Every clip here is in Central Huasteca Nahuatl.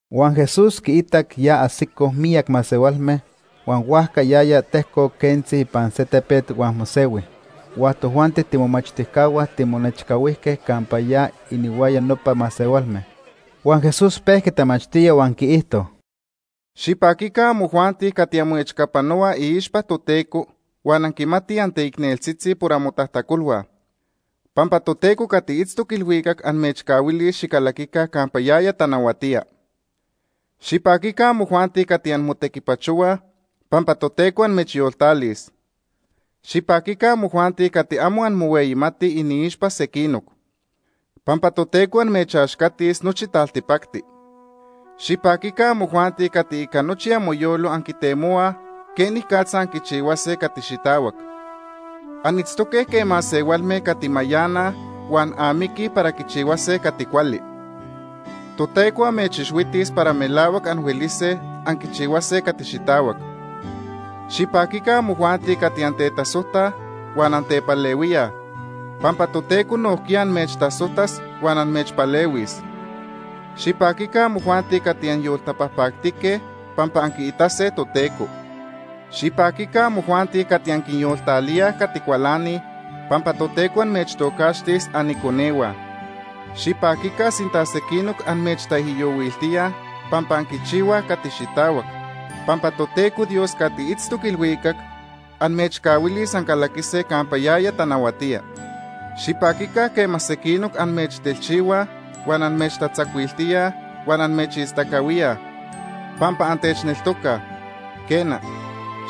Huan Jesús quiitac ya ajsicoj miyac masehualme, huan huajca yaya tejcoc quentzi ipan se tepet huan mosehui. Huan tojuanti tiimomachtijcahua timonechcahuijque campa ya inihuaya nopa masehualme. Huan Jesús pejqui tamachtía huan quiijto: “Xipaquica amojuanti cati anmoechcapanohuaj iixpa Toteco, huan anquimatij anteicneltzitzi por amotajtacolhua. Pampa Toteco cati itztoc ilhuicac amechcahuilis xicalaquica campa yaya tanahuatía. Xipaquica amojuanti cati anmotequipachohuaj, pampa Toteco amechyoltalis. Xipaquica amojuanti cati amo anmohueyimatij iniixpa sequinoc. Pampa Toteco amechaxcatis nochi taltipacti. Xipaquica amojuanti cati ica nochi amoyolo anquitemohuaj quenicatza anquichihuase cati xitahuac. Anitztoque quej masehualme cati mayanaj huan amiquij para quichihuase cati cuali. Toteco amechixhuitis para melahuac anhuelise anquichihuase cati xitahuac. Xipaquica amojuanti cati antetasojtaj huan antepalehuíaj, pampa Toteco nojquiya amechtasojtas huan amechpalehuis. Xipaquica amojuanti cati anyoltapajpactique, pampa anquiitase Toteco. Xipaquica amojuanti cati anquinyoltalíaj cati cualanij, pampa Toteco amechtocaxtis aniconehua. Xipaquica sinta sequinoc amechtaijyohuiltíaj pampa anquichihuaj cati xitahuac, pampa Toteco Dios cati itztoc ilhuicac amechcahuilis ancalaquise campa yaya tanahuatía. “Xipaquica quema sequinoc amechtelchihuaj huan amechtatzacuiltíaj huan amechistacahuíaj pampa antechneltocaj.” Quena,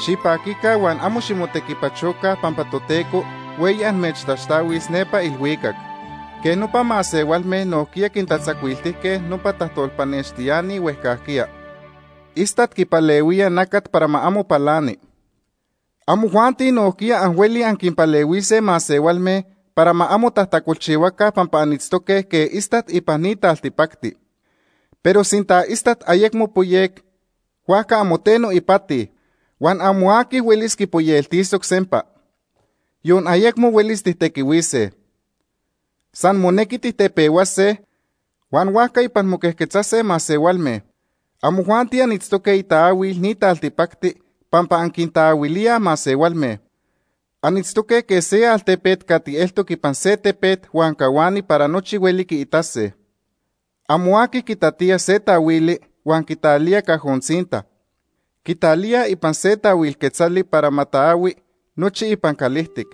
xipaquica huan amo ximotequipachoca pampa Toteco hueyi amechtaxtahuis nepa ilhuicac. Quej nopa masehualme nojquiya quintatzacuiltijque nopa tajtolpanextiani huejcajquiya. “Istat quipalehuía nacat para ma amo palani. Amojuanti nojquiya anhuelij anquinpalehuise masehualme para ma amo tajtacolchihuaca pampa anitztoque quej istat ipan ni taltipacti. Pero sinta istat ayecmo poyec, huajca amo teno ipati. Huan amo aqui huelis quipoyeltisoc sempa. Yon ayecmo huelis tijtequihuise. San monequi tijtepehuase, huan huajca ipan moquejquetzase masehualme. “Amojuanti anitztoque itaahuil ni taltipacti, pampa anquintaahuilíaj masehualme. Anitztoque quej se altepet cati eltoc ipan se tepet huan cahuani para nochi hueli quiitase. Amo aqui quitatía se taahuili, huan quitalía cajo tzinta. Quitalía ipan se taahuil quetzali para ma taahui nochi ipan calijtic.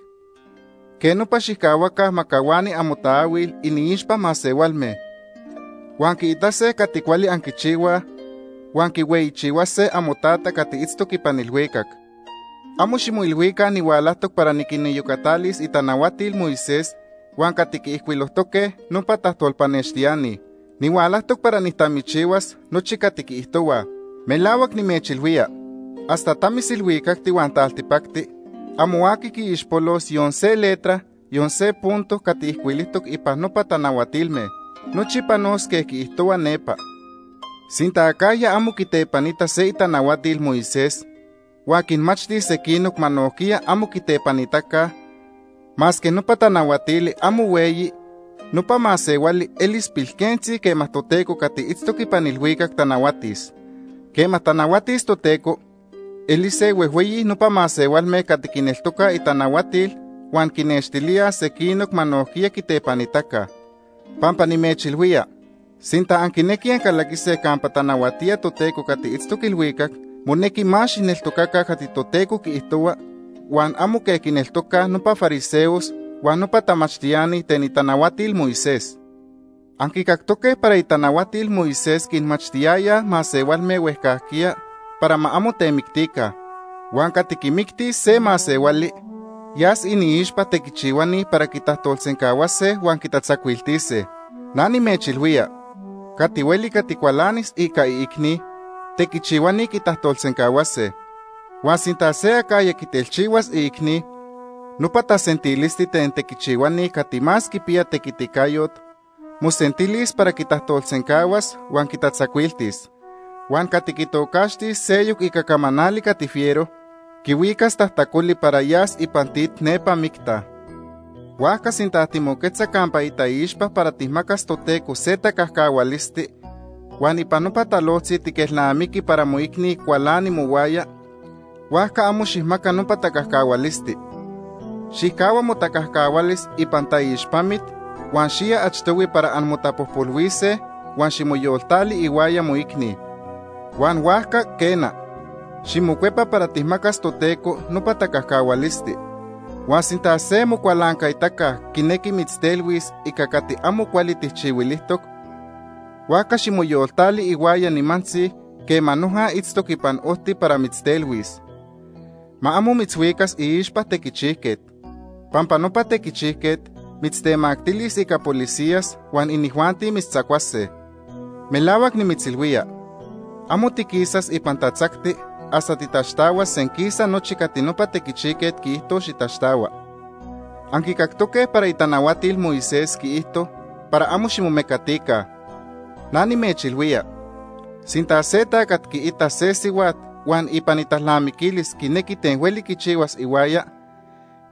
Quej nopa xijcahuaca ma cahuani amotaahuil iniixpa masehualme. Huan quiitase cati cuali anquichihuaj huan quihueyichihuase amoTata cati itztoc ipan ilhuicac. “Amo ximoilhuica nihualajtoc para niquiniyocatalis itanahuatil Moisés huan cati quiijcuilojtoque nopa tajtolpanextiani. Nihualajtoc para nijtamichihuas nochi cati quiijtohuaj. Melahuac nimechilhuía hasta tamis ilhuicacti huan taltipacti amo aqui quiixpolos yon se letra, yon se punto cati ijcuilijtoc ipan nopa tanahuatilme. Nochi panos quej quiijtohua nepa. Sinta acajya amo quitepanita se itanahuatil Moisés, huan quinmachtis sequinoc ma nojquiya amo quitepanitaca, masque nopa tanahuatili amo hueyi, nopa masehuali elis pilquentzi quema Toteco cati itztoc ipan ilhuicac tanahuatis. Quema tanahuatis Toteco, elise huejhueyi nopa masehualme cati quineltocaj itanahuatil huan quinnextilíaj sequinoc ma nojquiya quitepanitaca. Pampa nimechilhuía, sinta anquinequij ancalaquise campa tanahuatía Toteco cati itztoc ilhuicac, monequi más xijneltocaca cati Toteco quiijtohua huan amo quej quineltocaj nopa fariseos huan nopa tamachtiani ten itanahuatil Moisés. “Anquicactoque para itanahuatil Moisés quinmachtiyaya masehualme huejcajquiya para ma amo temictica. Huan cati quimictis se masehuali yas iniixpa tequichihuani para quitajtolsencahuase huan quitatzacuiltise. Na nimechilhuía, cati hueli cati cualanis ica iicni, tequichihuani quitajtolsencahuase. Huan sinta se acajya quitelchihuas iicni, nopa tasentilisti ten tequichihuani cati más quipiya tequiticayot mosentilis para quitajtolsencahuas huan quitatzacuiltis. Huan cati quitocaxtis seyoc ica camanali cati fiero, quihuicas tajtacoli para yas ipan tit nepa micta. “Huajca sinta timoquetza campa itaixpa para tijmacas Toteco se tacajcahualisti huan ipan nopa talojtzi tiquelnamiqui para moicni cualani mohuaya, huajca amo xijmaca nopa tacajcahualisti. Xijcahua motacajcahualis ipan taixpamit huan xiya achtohui para anmotapojpolhuise huan ximoyoltali ihuaya moicni. Huan huajca, quena, ximocuepa para tijmacas Toteco nopa tacajcahualisti. “Huan sinta se mocualancaitaca quinequi mitztelhuis ica cati amo cuali tijchihuilijtoc, huajca ximoyoltali ihuaya nimantzi quema noja itztoc ipan ojti para mitztelhuis. Ma amo mitzhuicas iixpa tequichijquet, pampa nopa tequichijquet mitztemactilis ica policías huan inijuanti mitztzacuase. Melahuac nimitzilhuía, amo tiquisas ipan tatzacti hasta titaxtahuas senquisa nochi cati nopa tequichijquet quiijtos xitaxtahua. “Anquicactoque para itanahuatil Moisés quiijto para amo ximomecatica. Na nimechilhuía, sinta se tacat quiita se sihuat huan ipan italnamiquilis quinequi ten hueli quichihuas ihuaya,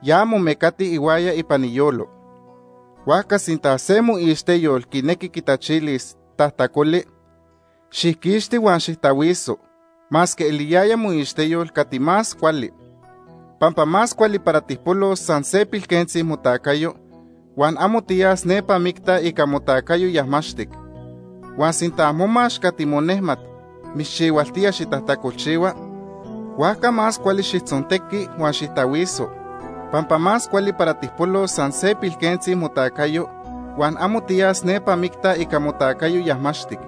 ya momecati ihuaya ipan iyolo. “Huajca sinta se moixteyol quinequi quitachilis tajtacoli, xijquixti huan xijtahuiso, masque eliyaya moixteyol cati más cuali. Pampa más cuali para tijpolos san se pilquentzi motacayo, huan amo tiyas nepa micta ica motacayo yajmaxtic. Huan sinta momax cati monejmat mitzchihualtía xitajtacolchihua, huajca más cuali xijtzontequi huan xijtahuiso, pampa más cuali para tijpolos san se pilquentzi motacayo huan amo tiyas nepa micta ica motacayo yajmaxtic.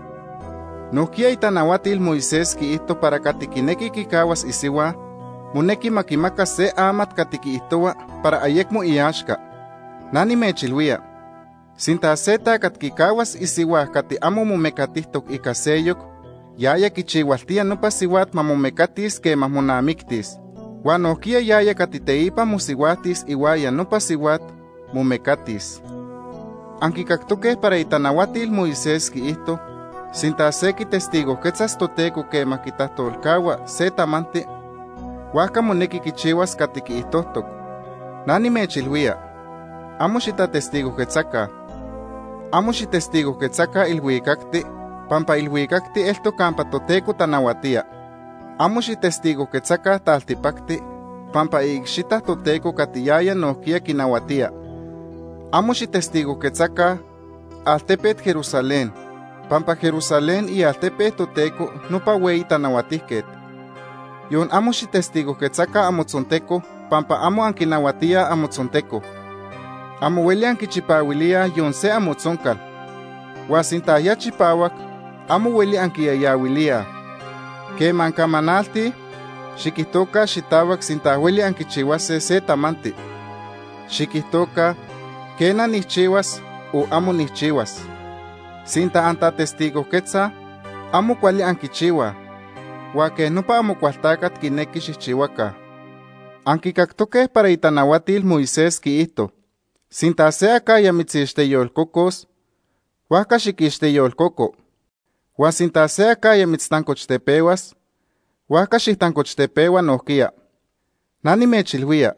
“Nojquiya itanahuatil Moisés quiijto para cati quinequi quicahuas isihua, monequi ma quimaca se amat cati quiijtohua para ayecmo iaxca. Na nimechilhuía, sinta se tacat quicahuas isihua cati amo momecatijtoc ica seyoc, yaya quichihualtía nopa sihuat ma momecatis quema monamictis. Huan nojquiya yaya cati teipa mosihuajtis ihuaya nopa sihuat, momecatis. “Anquicactoque para itanahuatil Moisés quiijto sinta se quitestigojquetzas Toteco quema quitajtolcahua se tamanti, huajca monequi quichihuas cati quiijtojtoc. Na nimechilhuía, amo xitatestigojquetzaca. Amo xijtestigojquetzaca ilhuicacti pampa ilhuicacti eltoc campa Toteco tanahuatía. Amo xijtestigojquetzaca taltipacti pampa iicxita Toteco cati yaya nojquiya quinahuatía. Amo xijtestigojquetzaca altepet Jerusalén, pampa Jerusalén ialtepe Toteco nopa Hueyi Tanahuatijquet. Yon amo xijtestigojquetzaca amotzonteco pampa amo anquinahuatíaj amotzonteco. Amo hueli anquichipahuilíaj yon se amotzoncal, huan sinta ya chipahuac, amo hueli anquiyayahuilíaj. Quema ancamanaltij, xiquijtoca xitahuac sinta hueli anquichihuase se tamanti. Xiquijtoca ‘quena, nijchihuas’ o ‘amo nijchihuas’. Sinta antatestigojquetzaj, amo cuali anquichihuaj, huan quej nopa Amocualtacat quinequi xijchihuaca. “Anquicactoque para itanahuatil Moisés quiijto sinta se acajya mitzixteyolcocos, huajca xiquixteyolcoco. Huan sinta se acajya mitztancochtepehuas, huajca xijtancochtepehua nojquiya. Na nimechilhuía,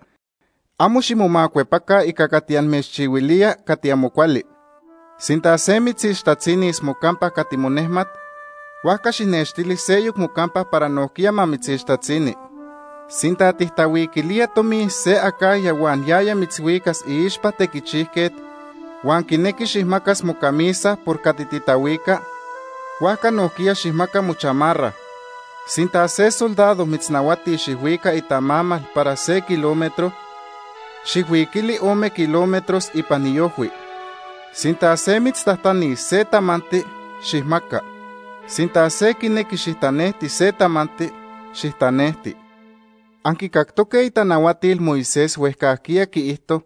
amo ximomacuepaca ica cati amechchihuilía cati amo cuali. Sinta se mitzixtatzinis mocampa cati monejmat, huajca xijnextili seyoc mocampa para nojquiya ma mitzixtatzini. Sinta tijtahuiquilía tomi se acajya huan yaya mitzhuicas iixpa tequichijquet huan quinequi xijmacas mocamisa por cati titahuica, huajca nojquiya xijmaca mochamarra. Sinta se soldado mitznahuatis xijhuica itamamal para se kilómetro, xijhuiquili ome kilómetros ipan iojhui. Sinta se mitztajtanis se tamanti, xijmaca. Sinta se quinequi xijtanejti se tamanti, xijtanejti. “Anquicactoque itanahuatil Moisés huejcajquiya quiijto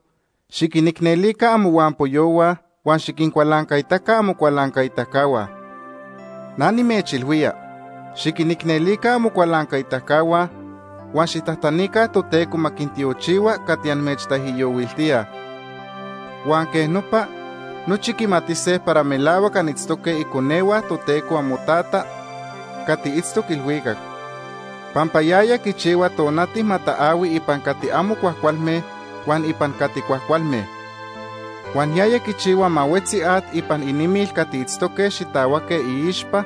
xiquinicnelica amohuampoyohua huan xiquincualancaitaca amocualancaitacahua. Na nimechilhuía, xiquinicnelica amocualancaitacahua huan xijtajtanica Toteco ma quintiochihua cati amechtaijyohuiltíaj. Huan quej nopa, nochi quimatise para melahuac anitztoque iconehua Toteco amoTata cati itztoc ilhuicac, pampa yaya quichihua tonati ma taahui ipan cati amo cuajcualme huan ipan cati cuajcualme. Huan yaya quichihua ma huetzi at ipan inimil cati itztoque xitahuaque iixpa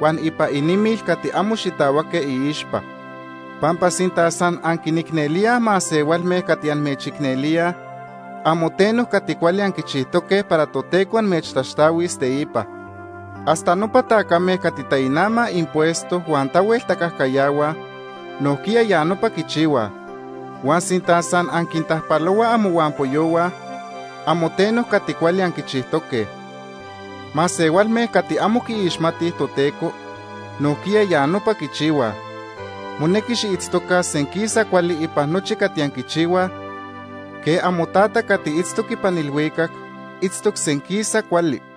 huan ipan inimil cati amo xitahuaque iixpa. Pampa sinta san anquinicnelíaj masehualme cati amechicnelíaj, amo teno cati cuali anquichijtoque para Toteco amechtaxtahuis teipa. Hasta nopa tacame cati tainamaj impuesto huan tahuel tacajcayahuaj nojquiya ya nopa quichihuaj. Huan sinta san anquintajpalohuaj amohuampoyohua, amo teno cati cuali anquichijtoque. Masehualme cati amo quiixmatij Toteco nojquiya ya nopa quichihuaj. Monequi xiitztoca senquisa cuali ipan nochi cati anquichihuaj quej amoTata cati itztoc ipan ilhuicac itztoc senquisa cuali.